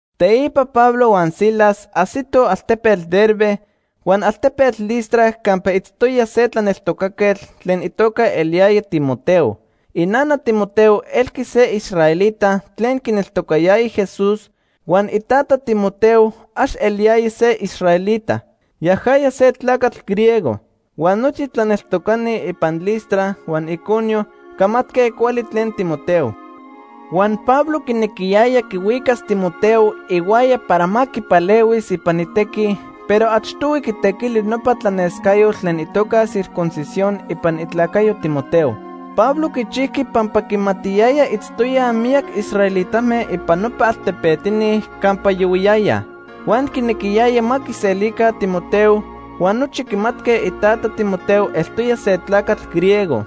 Teipa Pablo huan Silas ajsitoj altepetl Derbe huan altepetl Listra campa itztoya se tlaneltocaquetl tlen itoca eliyaya Timoteo. Inana Timoteo elqui se israelita tlen quineltocatoya Jesús huan itata Timoteo ax eliyaya se israelita, yajaya se tlacatl griego. Huan nochi tlaneltocani ipan Listra huan Iconio camatque cuali tlen Timoteo. Huan Pablo quinequiyaya quihuicas Timoteo ihuaya para ma quipalehuis ipan itequi, pero achtohui quitequili nopa tlanescayotl tlen itoca circuncisión ipan itlacayo Timoteo. Pablo quichijqui pampa quimatiyaya itztoyaj miyac israelitame ipan nopa altepetini campa yohuiyayaj. Huan quinequiyaya ma quiselica Timoteo, huan nochi quimatque itata Timoteo eltoya se tlacatl griego.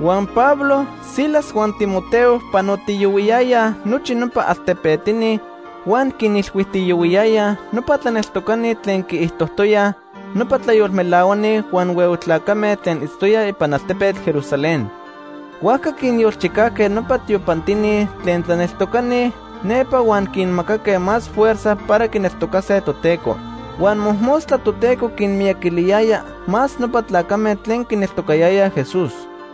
Huan Pablo, Silas huan Timoteo panotiyohuiyayaj nochi nopa altepetini huan quinilhuijtiyohuiyayaj nopa tlaneltocani tlen quiijtojtoyaj nopa tlayolmelahuani huan huehue tlacame tlen itztoyaj ipan altepetl Jerusalén. Huajca quinyolchicajque nopa tiopantini tlen tlaneltocani nepa huan quinmacaque más fuerza para quineltocase Toteco. Huan mojmostla Toteco quinmiyaquiliyaya más nopa tlacame tlen quineltocayayaj Jesús.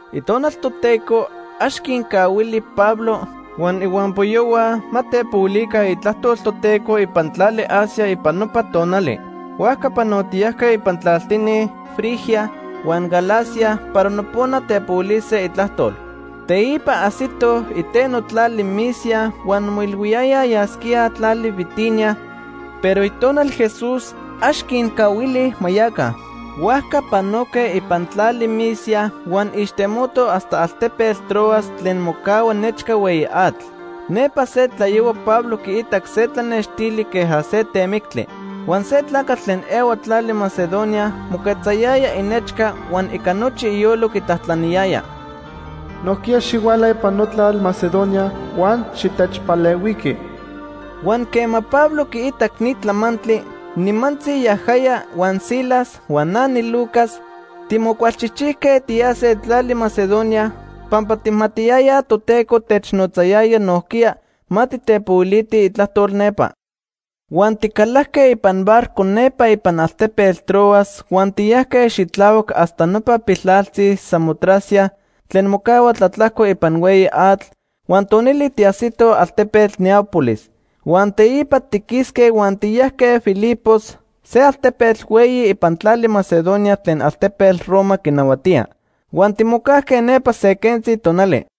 Itonal Toteco ax quincahuili Pablo huan ihuampoyohua ma tepohuilica itlajtol Toteco ipan tlali Asia ipan nopa tonali. Huajca panotiyajque ipan tlaltini Frigia huan Galacia para nopona tepohuilise itlajtol. Teipa ajsitoj iteno tlali Misia huan moilhuiyayaj yasquíaj tlali Bitinia, pero Itonal Jesús ax quincahuili ma yaca. Huajca panoque ipan tlali Misia huan ixtemotoj hasta altepetl Troas tlen mocahua nechca hueyi atl. Nepa se tlayohua Pablo quiitac se tlanextili queja se temictli. Huan se tlacatl tlen ehua tlali Macedonia moquetzayaya inechca huan ica nochi iyolo quitlajtlaniyaya: “Nojquiya xihuala ipan notlal Macedonia huan xitechpalehuiqui.” Huan quema Pablo quiitac ni tlamantli, nimantzi yajaya huan Silas huan na niLucas timocualchijchijque tiyase tlali Macedonia, pampa tijmatiyayaj Toteco technotzayaya nojquiya ma titepohuilitij itlajtol nepa. Huan ticalajque ipan barco nepa ipan altepetl Troas huan tiyajque xitlahuac hasta nopa piltlaltzi Samotracia tlen mocahua tlatlajco ipan hueyi atl, huan tonili tiajsitoj altepetl Neápolis. Huan teipa tiquisque huan tiyajque Filipos, se altepetl hueyi ipan tlali Macedonia tlen altepetl Roma quinahuatía. Huan timocajque nepa se quentzi tonali.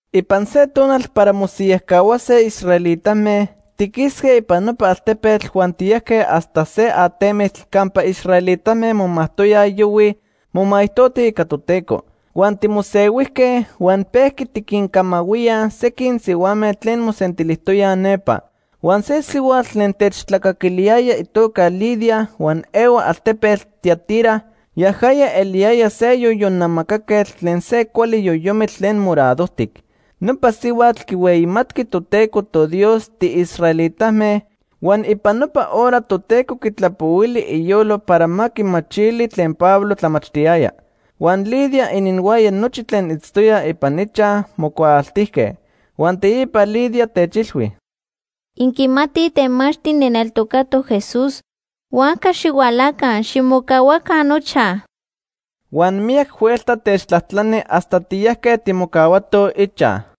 Ipan se tonal para mosiyajcahuase israelitame, tiquisque ipan nopa altepetl huan tiyajque hasta se atemitl campa israelitame momajtoyaj yohuij momaijtotij ica Toteco. Huan timosehuijque huan pejqui tiquincamahuíaj sequin sihuame tlen mosentilijtoyaj nepa. Huan se sihuatl tlen techtlacaquiliyaya itoca Lidia huan ehua altepetl Tiatira. Yajaya eliyaya se yoyon namacaquetl tlen se cuali yoyomitl tlen moradojtic. Nopa sihuatl quihueyimatqui Toteco toDios tiisraelitame huan ipan nopa hora Toteco quitlapohuili iyolo para ma quimachili tlen Pablo tlamachtiyaya. Huan Lidia ininhuaya nochi tlen itztoyaj ipan ichaj mocuaaltijque. Huan teipa Lidia techilhui: ―Inquimatij temachtli nijneltocatoc Jesús, huajca xihualaca, ximocahuaca nochaj. Huan miyac huelta techtlajtlani hasta tiyajque timocahuatoj ichaj.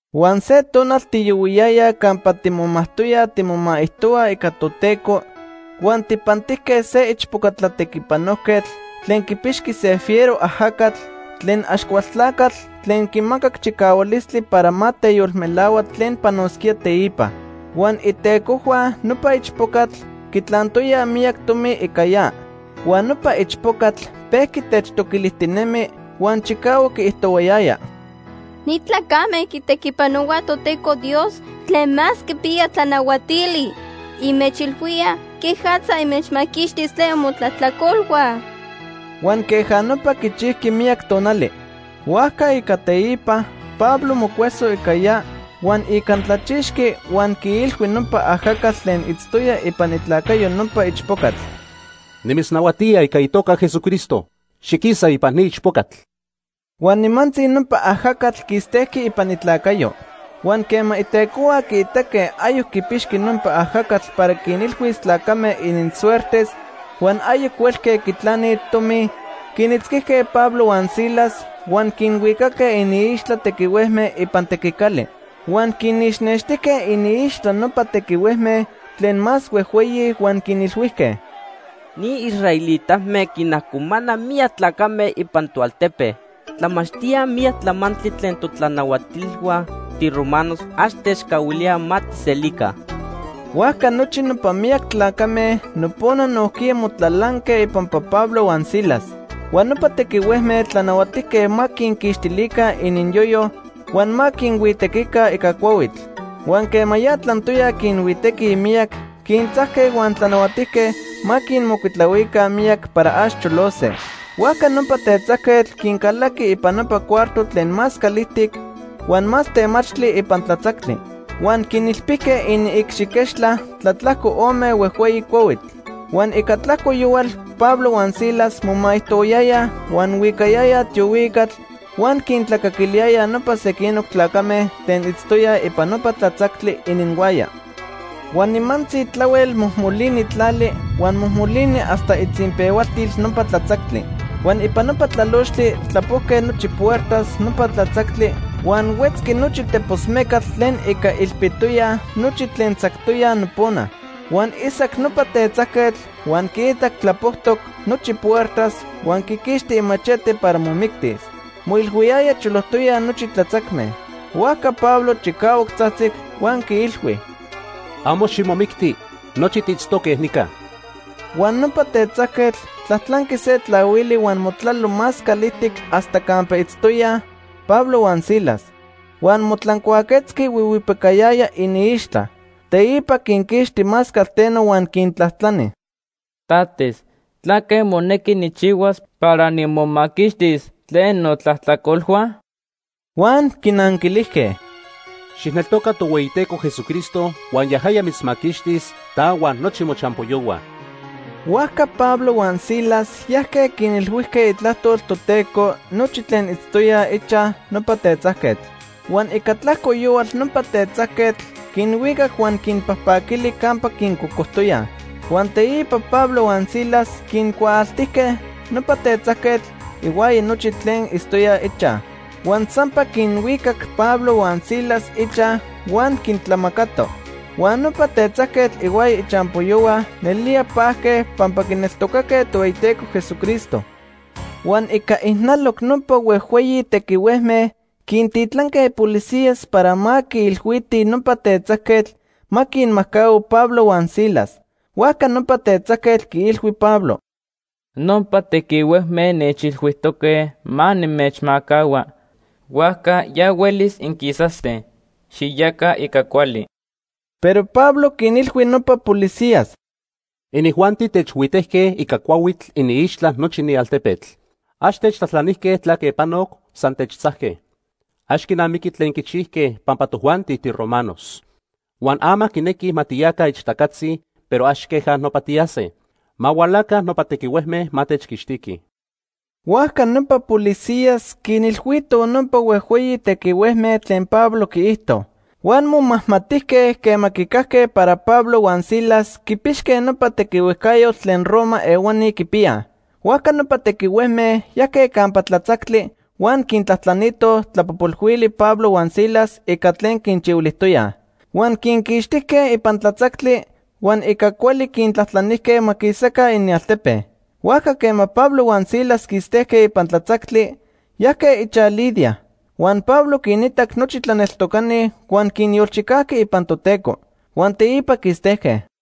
Huan se tonal tiyohuiyayaj campa timomajtoyaj timomaijtohuaj ica Toteco huan tijpantijque se ichpoca tlatequipanojquetl tlen quipixqui se fiero ajacatl tlen Axcualtlacatl tlen quimacac chicahualistli para ma teyolmelahua tlen panosquía teipa. Huan itecojhua nopa ichpocatl quitlantoyaj miyac tomi ica ya. Huan nopa ichpocatl pejqui techtoquilijtinemi huan chicahuac quiijtohuayaya: ―Ni tlacame quitequipanohuaj Toteco Dios Tlen Más Quipiya Tlanahuatili. Inmechilhuíaj quejatza inmechmaquixtis tlen imotlajtlacolhua. Huan queja nopa quichijqui miyac tonali. Huajca ica teipa Pablo mocueso ica ya huan icantlachixqui huan quiilhui nopa ajacatl tlen itztoya ipan itlacayo nopa ichpocatl: ―Nimitznahuatía ica itoca Jesucristo, xiquisa ipan ni ichpocatl. Huan nimantzi nopa ajacatl quistejqui ipan itlacayo. Huan quema itecohua quiitaque ayoc quipixqui nopa ajacatl para quinilhuis tlacame ininsuertes huan ayoc huelque quitlani tomi, quinitzquijque Pablo huan Silas huan quinhuicaque iniixtla tequihuejme ipan tequicali. Huan quinixnextijque iniixtla nopa tequihuejme tlen más huejhueyi huan quinilhuijque: ―Ni israelitame quinajcomanaj miyac tlacame ipan toaltepe. Tlamachtíaj miyac tlamantli tlen totlanahuatilhua tiromanos ax techcahuilíaj ma tijselica. Huajca nochi nopa miyac tlacame nopona nojquiya motlalanque ipampa Pablo huan Silas. Huan nopa tequihuejme tlanahuatijque ma quinquixtilica ininyoyo, huan ma quinhuitequica ica cuahuitl. Huan quema ya tlantoyaj quinhuitequij miyac, quintzajque huan tlanahuatijque ma quinmocuitlahuica miyac para ax cholose. Huajca nopa tetzajquetl quincalaqui ipan nopa cuarto tlen más calijtic huan más temachtli ipan tlatzactli. Huan quinilpijque iniicxiquechtla tlatlajco ome huejhueyi cuahuitl. Huan ica tlajco yohual Pablo huan Silas momaijtohuayayaj huan huicayayaj tiohuicatl huan quintlacaquiliyayaj nopa sequinoc tlacame tlen itztoyaj ipan nopa tlatzactli ininhuaya. Huan nimantzi tlahuel mojmolini tlali huan mojmolini hasta itzinpehualtil nopa tlatzactli. Huan ipan nopa tlalochtli tlapojque nochi ipuertas nopa tlatzactli huan huetzqui nochi tepos mecatl tlen ica ilpitoyaj nochi tlen tzactoyaj nopona. Huan isac nopa tetzajquetl, huan quiitac tlapojtoc nochi puertas huan quiquixti imachete para momictis. Moilhuiyaya cholojtoyaj nochi tlatzacme. Huajca Pablo chicahuac tzajtzic huan quiilhui: “Amo ximomicti. Nochi tiitztoque nica.” Huan nopa tetzajquetl tlajtlanqui se tlahuili huan motlalo más calijtic hasta campa itztoyaj Pablo huan Silas. Huan motlancuaquetzqui huihuipicayaya iniixtla. Teipa quinquixti más calteno huan quintlajtlani: ―Tates, ¿tlaque monequi nijchihuas para nimomaquixtis tlen notlajtlacolhua? Huan quinanquilijque: ―Xijneltoca Tohueyiteco Jesucristo huan yajaya mitzmaquixtis, ta huan nochi mochampoyohua. Huajca Pablo huan Silas yajque quinilhuijque itlajtol Toteco nochi tlen itztoyaj ichaj nopa tetzajquetl. Huan ica tlajco yohual nopa tetzajquetl quinhuicac huan quinpajpaquili campa quincocojtoyaj. Huan teipa Pablo huan Silas quincuaaltijque nopa tetzajquetl ihuaya nochi tlen itztoyaj ichaj. Huan sampa quinhuicac Pablo huan Silas ichaj huan quintlamacato. Huan nopa tetzajquetl ihuaya ichampoyohua nelía pajque pampa quineltocaque Tohueyiteco Jesucristo. Huan ica ijnaloc nopa huejhueyi tequihuejme quintitlanque policías para ma quiilhuitij nopa tetzajquetl ma quinmajcahua Pablo huan Silas. Huajca nopa tetzajquetl quiilhui Pablo: ―Nopa tequihuejme nechilhuijtoque ma nimechmajcahua. Huajca ya huelis inquisase. Xiyaca ica cuali. Pero Pablo quinilhui nopa policías: ―Inijuanti techhuitejque ica cuahuitl iniixtla nochi ni altepetl. Ax techtlajtlanijque tlaque panoc, san techtzajque. Ax quinamiqui tlen quichijque pampa tojuanti tiromanos. Huan ama quinequij ma tiyaca ixtacatzi, pero ax queja nopa tiyase. Ma hualaca nopa tequihuejme ma techquixtiquij. Huajca nopa policías quinilhuitoj nopa huejhueyi tequihuejme tlen Pablo quiijto. Huan momajmatijque quema quicajque para Pablo huan Silas quipixque nopa tequihuejcayotl tlen Roma ehuani quipiyaj. Huajca nopa tequihuejme yajque campa tlatzactli huan quintlajtlanitoj tlapojpolhuili Pablo huan Silas ica tlen quinchihuilijtoyaj. Huan quinquixtijque ipan tlatzactli huan ica cuali quintlajtlanijque ma quisaca inialtepe. Huajca quema Pablo huan Silas quistejque ipan tlatzactli, yajque ichaj Lidia. Huan Pablo quinitac nochi tlaneltocani huan quinyolchicajqui ipan Toteco. Huan teipa quistejque.